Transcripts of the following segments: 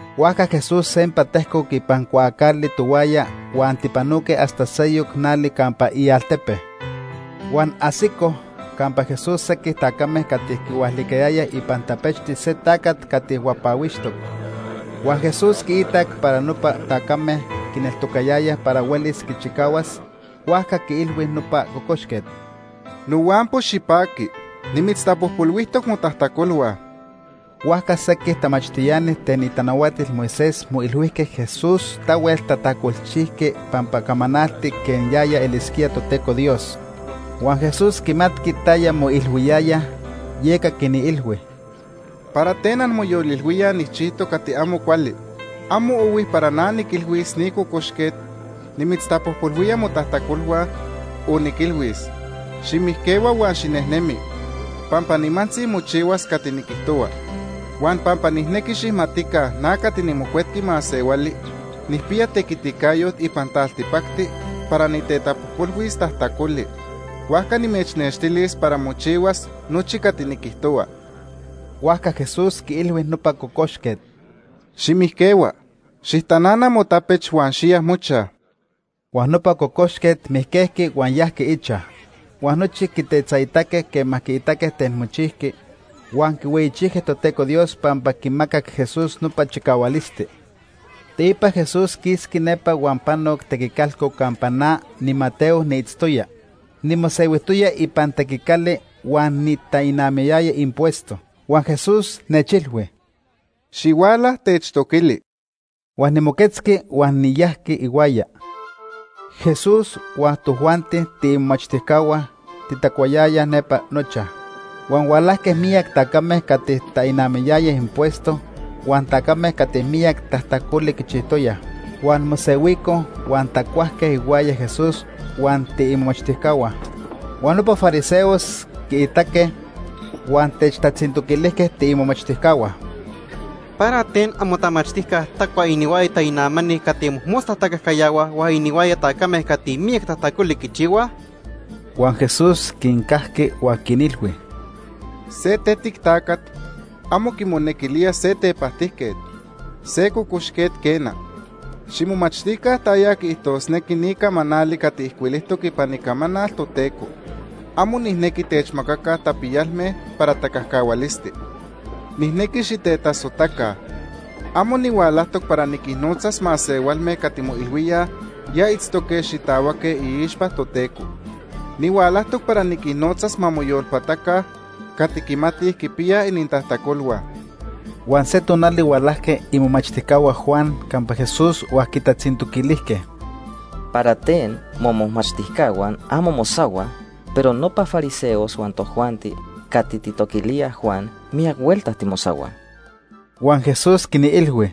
Huajca Jesús sempa tejcoc ipan cuaacali tohuaya huan tipanoque hasta seyoc nali campa ialtepe. Huan ajsicoj campa Jesús sequij tacame cati quihualicayayaj ipan tapechti se tacat cati huapahuixtoc. Huan Jesús quiitac para nopa tacame quineltocayayaj para huelis quichicahuas, huajca quiilhui nopa cocoxquet: ―Nohuampo, xipaqui. Nimitztapojpolhuijtoc motajtacolhua. Huajca sequij tamachtiani ten itanahuatil Moisés moilhuijque Jesús tahuel tajtacolchijqui pampa camanalti quej yaya elisquía Toteco Dios. Huan Jesús quimatqui taya moilhuiyayaj, yeca quinilhui: ―¿Para ten anmoyolilhuíaj nijchijtoc cati amo cuali? Amo ohui para na niquilhuis ni cocoxquet: ‘Nimitztapojpolhuía motajtacolhua’, o niquilhuis: ‘Ximijquehua huan xinejnemi’, pampa nimantzi mochihuas cati niquijtohua. Huan pampa nijnequi xijmatica na cati niMocuetqui Masehuali nijpiya tequiticayot ipan taltipacti para nitetapojpolhuis tajtacoli, huajca nimechnextilis para mochihuas nochi cati niquijtohua. Huajca Jesús quiilhui nopa cocoxquet: ―Ximijquehua, xijtanana motapech huan xiya mochaj. Huan nopa cocoxquet mijquejqui huan yajqui ichaj. Huan nochi quitetzaitaque quema quiitaque ten mochijqui. Huan quihueyichijque Toteco Dios pampa quimacac Jesús nopa chicahualisti. Teipa Jesús quisqui nepa huan panoc tequicalco campa na, niMateo, niitztoya. Nimosehuijtoya ipan tequicali huan nitainamayaya impuesto. Huan Jesús nechilhui: ―Xihuala, techtoquili. Huan nimoquetzqui huan niyajqui ihuaya. Jesús huan tojuanti tiimomachtijcahua titacuayayaj nepa nochaj. Huan hualajque miyac tacame cati tainamayayaj impuesto huan tacame cati miyac tajtacoli quichijtoyaj. Huan mosehuicoj huan tacuajque ihuaya Jesús huan tiimomachtijcahua. Huan nopa fariseos quiitaque, huan techtatzintoquilijque tiimomachtijcahua: ―¿Para ten amotamachtijca tacua inihuaya tainamani cati mojmosta tacajcayahuaj huan inihuaya tacame cati miyac tajtacoli quichihuaj? Huan Jesús quincajqui huan quinilhui: ―Se tetic tacat amo quimonequilía se tepajtijquet, se cocoxquet, quena. Ximomachtica taya quiijtosnequi ni camanali cati ijcuilijtoc ipan Icamanal Toteco: ‘Amo nijnequi techmacaca tapiyalme para tacajcahualisti. Nijnequi xitetasojtaca.’ Amo nihualajtoc para niquinnotzas masehualme cati moilhuíaj ya itztoque xitahuaque iixpa Toteco. Nihualajtoc para niquinnotzas ma moyolpataca cati quimatij quipiyaj inintajtacolhua. Huan se tonali hualajque imomachtijcahua Juan campa Jesús huan quitatzintoquilijque: ―¿Para ten momomachtijcahua amo mosahuaj, pero nopa fariseos huan tojuanti cati tijtoquilíaj Juan miyac huelta timosahuaj? Huan Jesús quinilhui: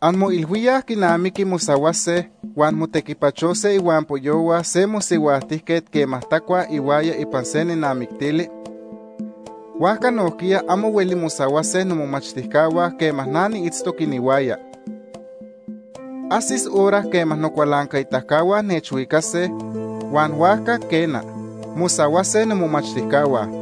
―¿Anmoilhuíaj quinamiqui mosahuase huan motequipachose ihuampoyohua se mosihuajtijquet quema tacuaj ihuaya ipan se nenamictili? Huajca nojquiya amo hueli mosahuase nomomachtijcahua quema na niitztoc inihuaya. Ajsis hora quema nocualancaitacahua nechhuicase, huan huajca, quena, mosahuase nomomachtijcahua.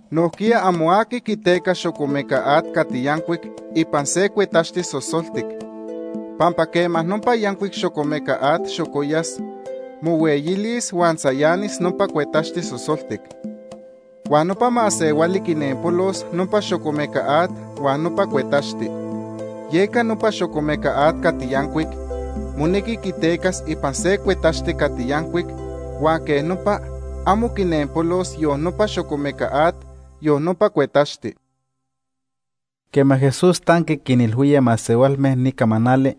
Nojquiya amo aqui quiteca xocomeca at cati yancuic ipan se cuetaxti sosoltic, pampa quema nopa yancuic xocomeca at xocoyas, mohueyilis, huan tzayanis nopa cuetaxti sosoltic. Huan nopa masehuali quinenpolos nopa xocomeca at huan nopa cuetaxti. Yeca nopa xocomeca at cati yancuic monequi quitecas ipan se cuetaxti cati yancuic huan quej nopa amo quinenpolos yon nopa xocomeca at, yon nopa cuetaxti.” Quema Jesús tanqui quinilhuía masehualme ni camanali,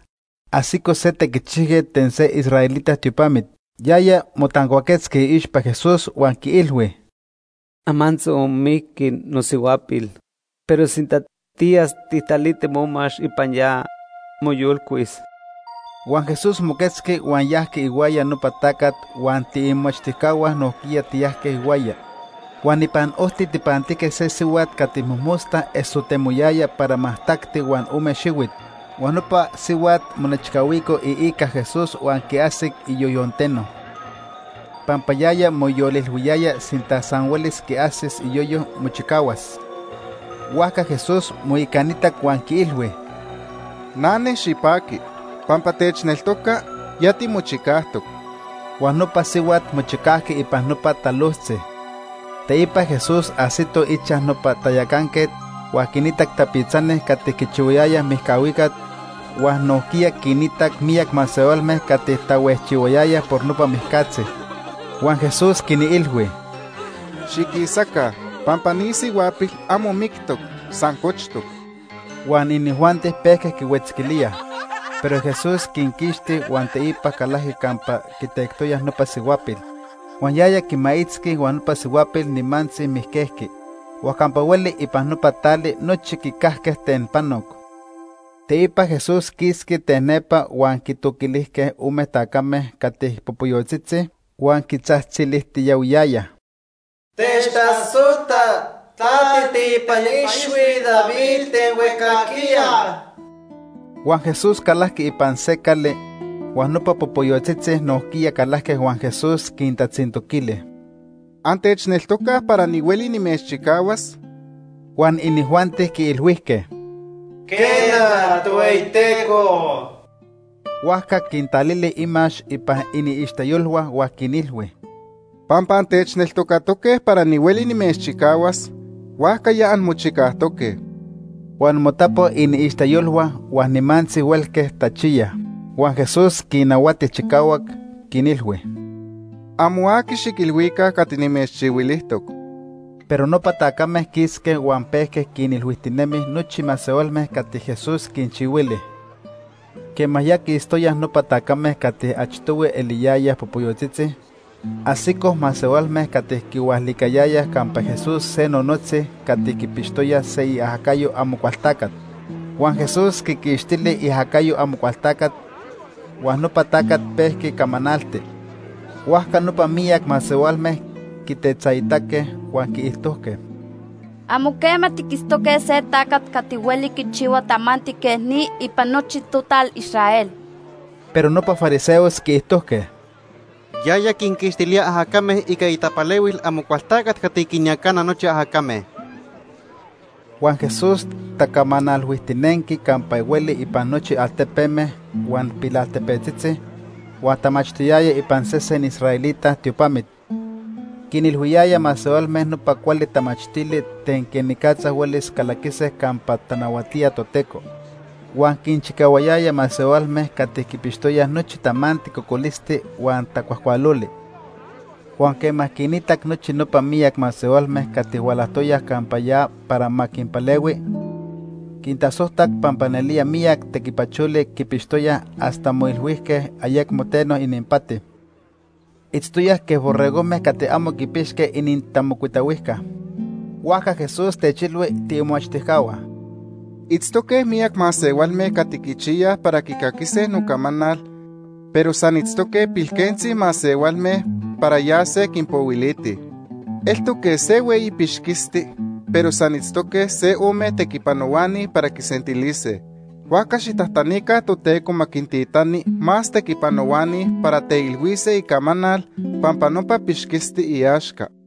ajsico se tequichijquet ten se israelita tiopamit. Yaya motancuaquetzqui iixpa Jesús huan quiilhui: ―Amantzi onmijqui nosihuapil, pero sinta tiyas tijtaliti momax ipan ya, moyolcuis. Huan Jesús moquetzqui huan yajqui ihuaya nopa tacat huan tiimomachtijcahua nojquiya tiyajque ihuaya. Huan ipan ojti tijpantijque se sihuat cati mojmosta esotemoyaya para majtacti huan ome xihuit. Huan nopa sihuat monechcahuico iica Jesús huan quiajsic iyoyonteno. Pampa yaya moyolilhuiyaya sinta san huelis quiajsis iyoyo, mochicahuas. Huajca Jesús moicanitac huan quiilhui: ―Nane, xipaqui. Pampa techneltoca, ya timochicajtoc. Huan nopa sihuat mochicajqui ipan nopa talojtzi. Teipa Jesús ajsito ichaj nopa tayacanquet huan quinitac tapitzani cati quichihuayayaj mijcahuicat huan nojquiya quinitac miyac masehualme cati tahuejchihuayayaj por nopa mijcatzi. Huan Jesús quinilhui: ―Xiquisaca, pampa ni sihuapil amo mictoc, san cochtoc. Huan inijuanti pejque quihuetzquilíaj. Pero Jesús quinquixti huan teipa calajqui campa quitectoyaj nopa sihuapil. Huan yaya quimaitzqui huan nopa sihuapil nimantzi mijquejqui. Huan campa hueli ipan nopa tali nochi quicajque ten panoc. Teipa Jesús quisqui ten nepa huan quitoquilijque ome tacame cati popoyotzitzi huan quitzajtzilijtiyahuiyayaj: ―Techtasojta, ta tiiteipan ixhui David ten huejcajquiya. Huan Jesús calajqui ipan se cali, huan nopa popoyotzitzi nojquiya calajque huan Jesús quintatzintoquili: ―¿Antechneltocaj para nihueli nimechchicahuas? Huan inijuanti quiilhuijque: ―Quena, Tohueyiteco. Huajca quintalili imax ipan iniixteyolhua huan quinilhui: ―Pampa antechneltocatoque para nihueli nimechchicahuas, huajca ya anmochicajtoque. Huan motapo iniixteyolhua huan nimantzi huelque tachiyaj. Huan Jesús quinnahuati chicahuac, quinilhui: ―Amo aqui xiquilhuica cati nimechchihuilijtoc. Pero nopa tacame quisque huan pejque quinilhuijtinemij nochi masehualme cati Jesús quinchihuili. Quema ya quistoyaj nopa tacame cati achtohui eliyayaj popoyotzitzi, ajsicoj masehualme cati quihualicayayaj campa Jesús se nonotzi cati quipixtoya se iajacayo Amocualtacat. Huan Jesús quiquixtili iajacayo Amocualtacat, huan nopa tacat pejqui camanalti. Huajca nopa miyac masehualme quitetzaitaque huan quiijtojque: ―Amo quema tiquitztoque se tacat cati hueli quichihua tamanti quej ni ipan nochi total Israel. Pero nopa fariseos quiijtojque: ―Yaya quinquixtilía ajacame ica itapalehuil Amocualtacat cati quinyacana nochi ajacame. Huan Jesús tacamanalhuijtinenqui campa hueli ipan nochi altepeme huan pilaltepetzitzi, huan tamachtiyaya ipan sesen israelita tiopamit. Quinilhuiyaya masehualme nopa cuali tamachtili ten quenicatza huelis calaquise campa tanahuatía Toteco. Huan quinchicahuayaya masehualme cati quipixtoyaj nochi tamanti cocolisti huan tacuajcualoli. Huan quema quinitac nochi nopa miyac masehualme cati hualajtoyaj campa ya para ma quinpalehui, quintasojtac pampa nelía miyac tequipacholi quipixtoyaj hasta moilhuijque ayecmo teno ininpati. Itztoyaj quej borregojme cati amo quipixque inintamocuitahuijca. Huajca Jesús techilhui tiimomachtijcahua: ―Itztoque miyac masehualme cati quichiyaj para quicaquise nocamanal, pero san itztoque pilquentzi masehualme para yase quinpohuilitij. Eltoc quej se hueyi pixquisti pero san itztoque se ome tequipanohuani para quisentilise. Huajca xijtajtanica Toteco ma quintitani más tequipanohuani para teilhuise icamanal pampa nopa pixquisti iaxca.